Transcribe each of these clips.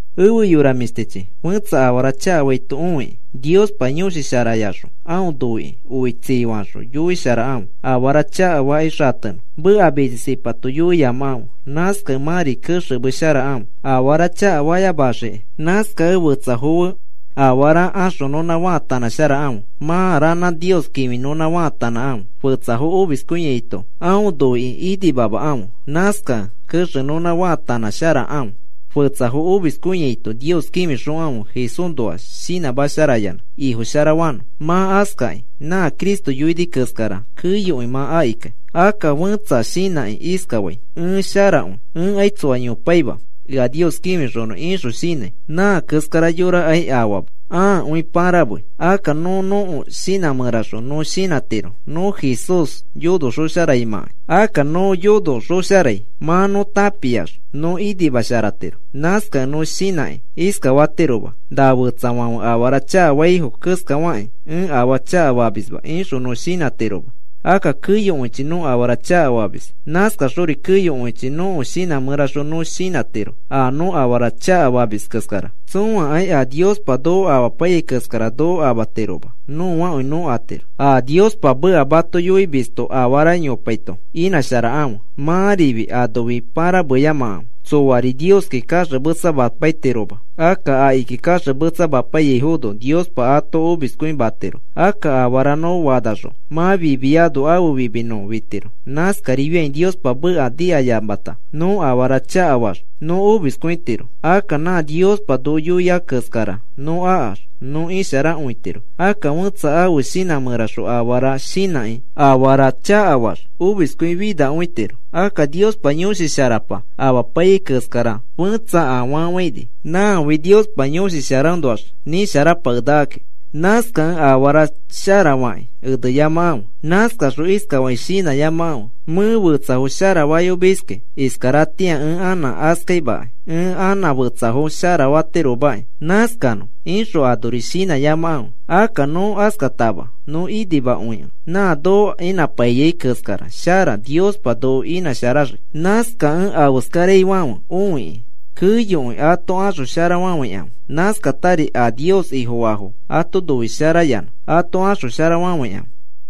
Efe yora mĩshtichi, fẽtsa afara chakafaito õikĩ, Niospa Yõshi Sharayaxõ aõ noikĩ oi tsii faxõ yoisharakãfe, afara chakafakĩ xatenõ. Meka mitsisipato yoiyamakãfe. Nãskakẽ mãri kexemesharakãfe afara chakafayamaxiki. Nãskakẽ fetsafo fe afara axonõnã faatanãsharakãfe. Mã ranã Nios kĩfinõnã faatanãkãfe. Fetsa omiskõiaito aõ noikĩ inimamakãfe, nãskakẽ kexenõnã faatanãsharakãfe. Fetsa omiskõiaito Nios kĩfixokãfe Jesúsnoa shinãmasharayanã Ifo sharafanõ. Mã askakĩ nã Cristo yoini keskara keyokõi mã akikai. Akka fẽtsa shinãkĩ iskafai: “Ẽ sharakõi. Ẽkai tsoa yopaima ea Nios kĩfixonõ,” ixõ shinãi. Nã keskara yorakai afama, ãakõi pãramei. Akka nõ nõko shinã mẽraxõ nõ shinãtiro nõ Jesús yonoxõsharaimãkai. Akka nõ yonoxõsharai mã nõ tãpiax nõ inimasharatiro. Nãskakĩ nõ shinãkĩ iskafatiroma: “Na fetsafãfe afara chakafaifo keskafakĩ ẽ afaa chakafamisma,” ixõ nõ shinãtiroma. Akka keyokõichi nõ afara chakafamis. Nãskaxori keyokõichi nõko shinã mẽraxõ nõ shinãtiro a nõ afara chakafamis keskara. Tsõakai a Niospa noko amapaiyai keskara noko amatiroma, nõakõi nõ atiro. A Niospa meka mato yoimisto afara yopaito inãsharakãfe. Mãrifi anofi pãrameyamakãfe, tsoari Nioski kaxemetsamapaitiroma. Akka akiki kaxemetsamapaiyaifono Niospa ato omiskõimatiro. Akka afara nõ fanaxõ mã fimiano ãfe fimi nõ fitiro. Nãskarifiakĩ Niospa meka nikayamata nõ afara chakafaax nõ omiskõitiro. Akka nã Niospa noko yoia keskara nõ akax nõ isharakõitiro. Akka fẽtsa ãfe shinã mẽraxõ afara shinãkĩ afara chakafaax omiskõifinakõitiro. Akka Niospa Yõshi Sharapa amapaiyai keskara fẽtsa afafãini, nãfi Niospa Yõshi Sharaõnoax nisharapakenakaki. Nãskakẽ afara sharafakĩ eneyamakãfe. Nãskaxõ iskafakĩ shinãyamakãfe: “Mẽ fetsafo sharafayomiski iskaratĩa ẽ anã askaimakai, ẽ anã fetsafo sharafatiromaki. Nãskanõ,” ixõ anori shinãyamakãfe. Akka nõ askatama nõ inimakõikẽ nã noko inãpaiyai keskara shara Niospa noko inãsharaxii. Nãskakẽ afeskaraifãfe õikĩ keyokõi ato axosharafafãikãfe. Nãskatari a Nios Ifofaafo ato noisharayanã ato axosharafafãikãfe.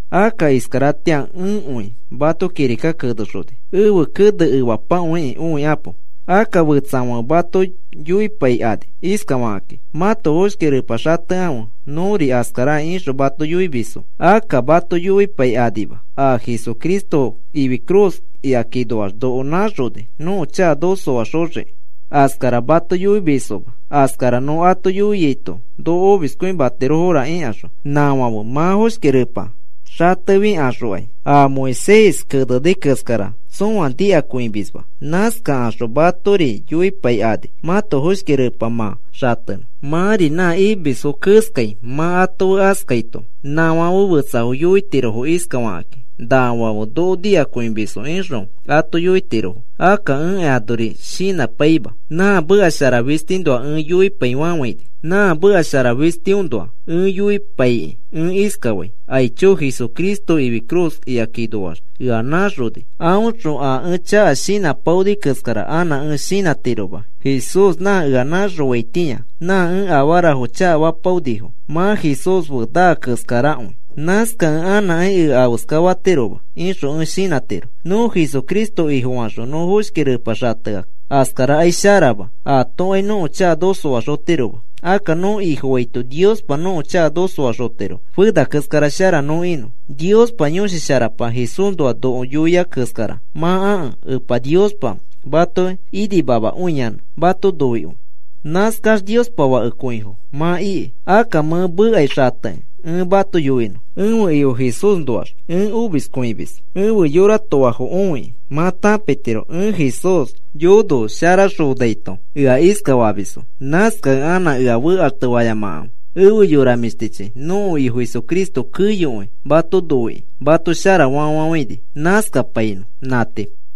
Akka iskaratĩa ẽkõi mato kirika kenexoni. Ẽfe kene efapakõikĩ õikapo. Akka fetsafãfe mato yoipaikani iskafakakĩ: “Mãto foshki repa xatekãfe nõri askaraki,” ixõ mato yoimisfo. Akka mato yoipaikanima a Jesucristo ifi cruz ikakinoax noko nãxoni nõko chaka noko soaxoxiki. Askara mato yoimisfoma, askara nõ ato yoiaito noko omiskõimatirofora ikaxõ. Nãfãfe mã foshki repa xatefikaxokai a Moisés keneni keskara tsõa nikakõimisma. Nãskakaxõ matori yoipaikani mãto foshki repari mã xatenõ. Mãri nã imisfo keskai mã ato fe askaito, nãfãfe fetsafo yoitirofo iskafakakĩ: “Nafãfe noko nikakõimisfo,” ixõ ato yoitirofo. Akka ẽkai anori shinãpaima, nã meka shara fistiõnoa ẽ yoipaifafãini. Nã meka shara fistiõnoa ẽ yoipaikĩ ẽ iskafai: “Aicho, Jesucristo ifi cruz ikakinoax ea nãxoni, aõxõ a ẽ chaka shinãpaoni keskara anã ẽ shinãtiroma. Jesús nã ea nãxofaitĩa nã ẽ afarafo chakafapaonifo mã Jesús fe naa keskarakõi. Nãskakẽ anãkai ea afeska fatiroma,” ixõ ẽ shinãtiro. Nõ Jesucristo Ifofaxõ nõ foshki repa xatea askarakai sharama atokai nõko chaka noko soaxotiroma. Akka nõ Ifofaito Niospa nõko chaka noko soaxotiro fena keskara shara nõ inõ. Niospa Yõshi Sharapa Jesúsnoa noko yoia keskara mã akẽ Epa Niospa mato inimamakõiyanã mato noikõi. Nãskax Niospa fakekõifo mã iki. Akka mẽ mekai xatekĩ ẽ mato yoinõ. Ẽfe Ifo Jesúsnoax ẽ omiskõimis, ẽfe yora toafo õikĩ mã tãpitiro ẽ Jesús yonosharaxonaito ea iskafamisfo. Nãskakẽ anã ea fekaxtefayamakãfe. Efe yora mĩshtichi, nõko Ifo Jesucristo keyokõi mato noikĩ mato sharafa fafafãini. Nãskapainõ. Nã tii. Pablo